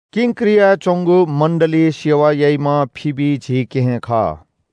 किंक्रियाय् च्‍वंगु मण्‍डलीइ सेवा याइम्‍ह फिबी झी केहेँ खः।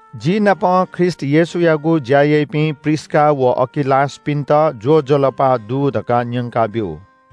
जिनापं ख्रीष्‍ट येशूयागु ज्‍या याइपिं प्रिस्‍का व अकिलासपिन्‍त ज्‍वजलपा दु धकाः न्‍यंकाब्‍यु।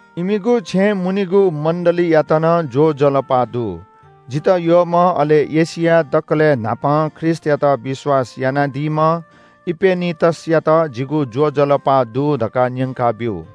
इमिगु छेँय् मुनीगु मण्‍डलीयात नं ज्‍वजलपा दु। जितः यःम्‍ह अले एशियाय् दकलय् न्‍हापां ख्रीष्‍टयात विश्‍वास यानादीम्‍ह इपेनितसयात जिगु ज्‍वजलपा दु धकाः न्‍यंकाब्‍यु।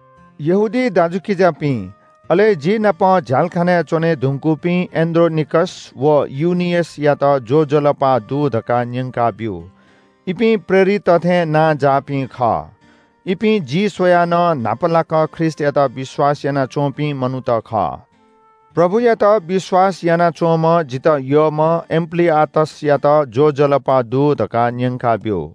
यहूदी दाजुकिजापिं, अले जि नाप झ्‍यालखानय् च्‍वनेधुंकूपिं एन्‍ड्रोनिकस व युनियसयात ज्‍वजलपा दु धकाः न्‍यंकाब्‍यु। इपिं प्रेरितत थें नांजाःपिं खः। इपिं जि स्‍वयाः नं न्‍हापालाक ख्रीष्‍टयात विश्‍वास यानाच्‍वंपिं मनूत खः। प्रभुयात विश्‍वास यानाच्‍वंम्‍ह जितः यःम्‍ह एम्‍प्‍लीआतसयात ज्‍वजलपा दु धकाः न्‍यंकाब्‍यु।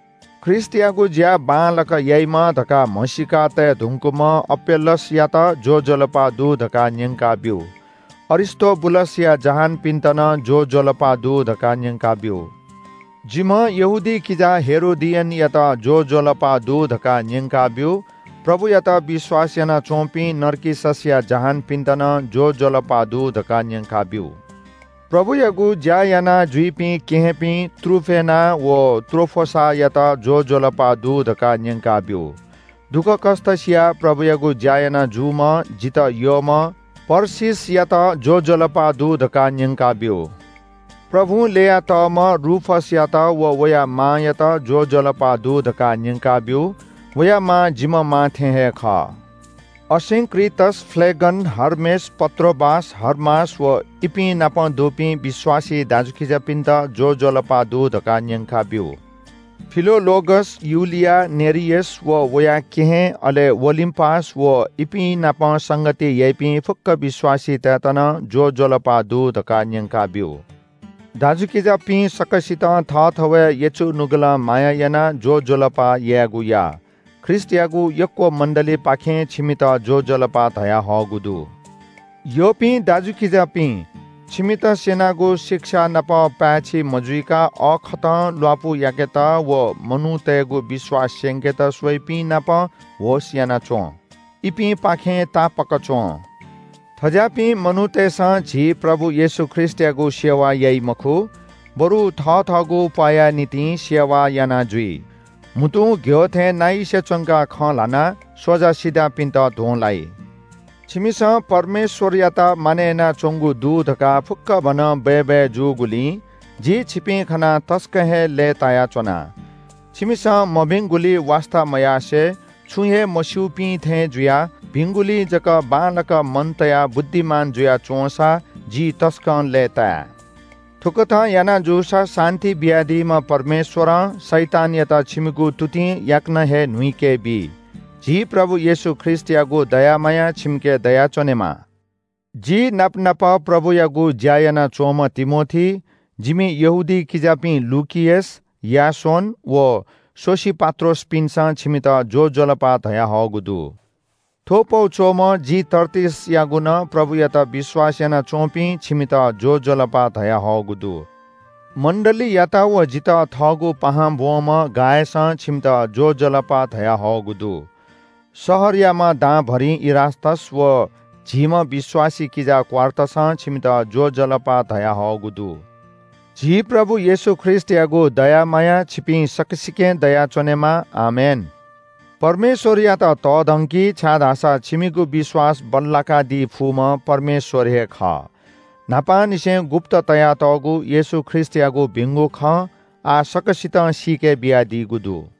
ख्रीष्‍टयागु ज्‍या बांलाक याइम्‍ह धकाः म्‍हसीका तये धुंकूम्‍ह अपेल्‍लेसयात ज्‍वजलपा दु धकाः न्‍यंकाब्‍यु। अरिस्‍तोबुलसया जहानपिन्‍त नं ज्‍वजलपा दु धकाः न्‍यंकाब्‍यु। जिम्‍ह यहूदी किजा हेरोदियनयात ज्‍वजलपा दु धकाः न्‍यंकाब्‍यु। प्रभुयात विश्‍वास यानाच्‍वंपिं नर्किससया जहानपिन्‍त नं ज्‍वजलपा दु धकाः न्‍यंकाब्‍यु। प्रभुयागु ज्‍या यानाजुइपिं केहेँपिं त्रुफेना व त्रोफोसायात ज्‍वजलपा दु धकाः न्‍यंकाब्‍यु। दुःखकष्‍ट सियाः प्रभुयागु ज्‍या याना जूम्‍ह जितः यःम्‍ह परसीसयात ज्‍वजलपा दु धकाः न्‍यंकाब्‍यु। प्रभुं ल्‍ययातःम्‍ह रूफसयात व वया मांयात ज्‍वजलपा दु धकाः न्‍यंकाब्‍यु। वया मां जिम्‍ह मां थें हे खः। असिंक्रितस, फ्‍लेगन, हर्मेस, पत्रोबास, हर्मास व इपिं नाप दुपिं विश्‍वासी दाजुकिजापिन्‍त ज्‍वजलपा दु धकाः न्‍यंकाब्‍यु। फिलोलोगस, युलिया, नेरियस व वया केहेँ, अले ओलिम्‍पास, व इपिं नाप संगति याइपिं फुक्‍क विश्‍वासीतय्‌त नं ज्‍वजलपा दु धकाः न्‍यंकाब्‍यु। दाजुकिजापिं सकसितं थःथवय् यचु नुगलं माया यानाः ज्‍वजलपा यायेगु या। ख्रीष्‍टयागु यक्‍व मण्‍डलीपाखें छिमित ज्‍वजलपा धयाहःगु दु। यःपिं दाजुकिजापिं, छिमित स्‍यनागु शिक्षा नाप पाय्‌छि मजुइक अःखतं ल्‍वापु याकेत व मनूतय्‌गु विश्‍वास स्‍यंकेत स्‍वइपिं नाप होश‍ यानाच्‍वँ। इपिंपाखें तापाक च्‍वँ। थज्‍याःपिं मनूतय्‌सं झी प्रभु येशू ख्रीष्‍टयागु सेवा याइ मखु, बरु थथःगु प्‍वाःया निंतिं सेवा याना जुइ। म्‍हुतुं घ्‍यः थें नाइसे च्‍वंक खँ ल्‍हानाः स्‍वजासिजापिन्‍त ध्‍वं लाइ। छिमिसं परमेश्‍वरयात मानय् यानाच्‍वंगु दु धकाः फुक्‍कभनं बय्‌बय् जूगुलिं जि छिपिं खनाः तसकं हे लय्‌तायाच्‍वना। छिमिसं मभिंगुली वास्‍ता मयासें छुं हे मस्‍यूपिं थें जुयाः भिंगुली जक बांलाक मन तयाः बुद्धिमान जुया च्‍वंसा जि तसकं लय्‌ताये। थुकथं याना जूसा शान्‍ति बियादीम्‍ह परमेश्‍वरं शैतानयात छिमिगु तुतिं याकनं हे न्‍हुइके बी। झी प्रभु येशू ख्रीष्‍टयागु दया माया छिमिके दयाच्‍वनेमा। जि नाप नाप प्रभुयागु ज्‍या यानाच्‍वंम्‍ह तिमोथी, जिमि यहूदी किजापिं लुकियस, यासोन व सोसिपात्रोसपिन्‍सं छिमित ज्‍वजलपा धयाहःगु दु। थ्‍व पौ च्‍वःम्‍ह जि तर्तियसयागु नं प्रभुयात विश्‍वास यानाच्‍वंपिं छिमित ज्‍वजलपा धयाहःगु दु। मण्‍डलीयात व जितः थःगु पाहां ब्‍वंम्‍ह गायसं छिमित ज्‍वजलपा धयाहःगु दु। शहरयाम्‍ह दांभरिं इरास्‍तस व झीम्‍ह विश्‍वासी किजा क्‍वार्टसं छिमित ज्‍वजलपा धयाहःगु दु। [झी प्रभु येशू ख्रीष्‍टयागु दया माया छिपिं सकसिकें दयाच्‍वनेमा। आमेन।] परमेश्‍वरयात तःधंकि, छाय्‌धाःसा छिमिगु विश्‍वास बल्‍लाकादी फुम्‍ह परमेश्‍वर हे खः। न्‍हापांनिसें गुप्‍त तयातःगु येशू ख्रीष्‍टयागु भिंगु खँ आः सकसितं सीके बियादीगु दु।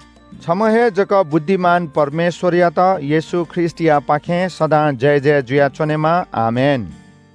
छम्‍ह हे जक बुद्धिमान परमेश्‍वरयात येशू ख्रीष्‍टयापाखें सदां जयजय जुयाच्‍वनेमा। आमेन।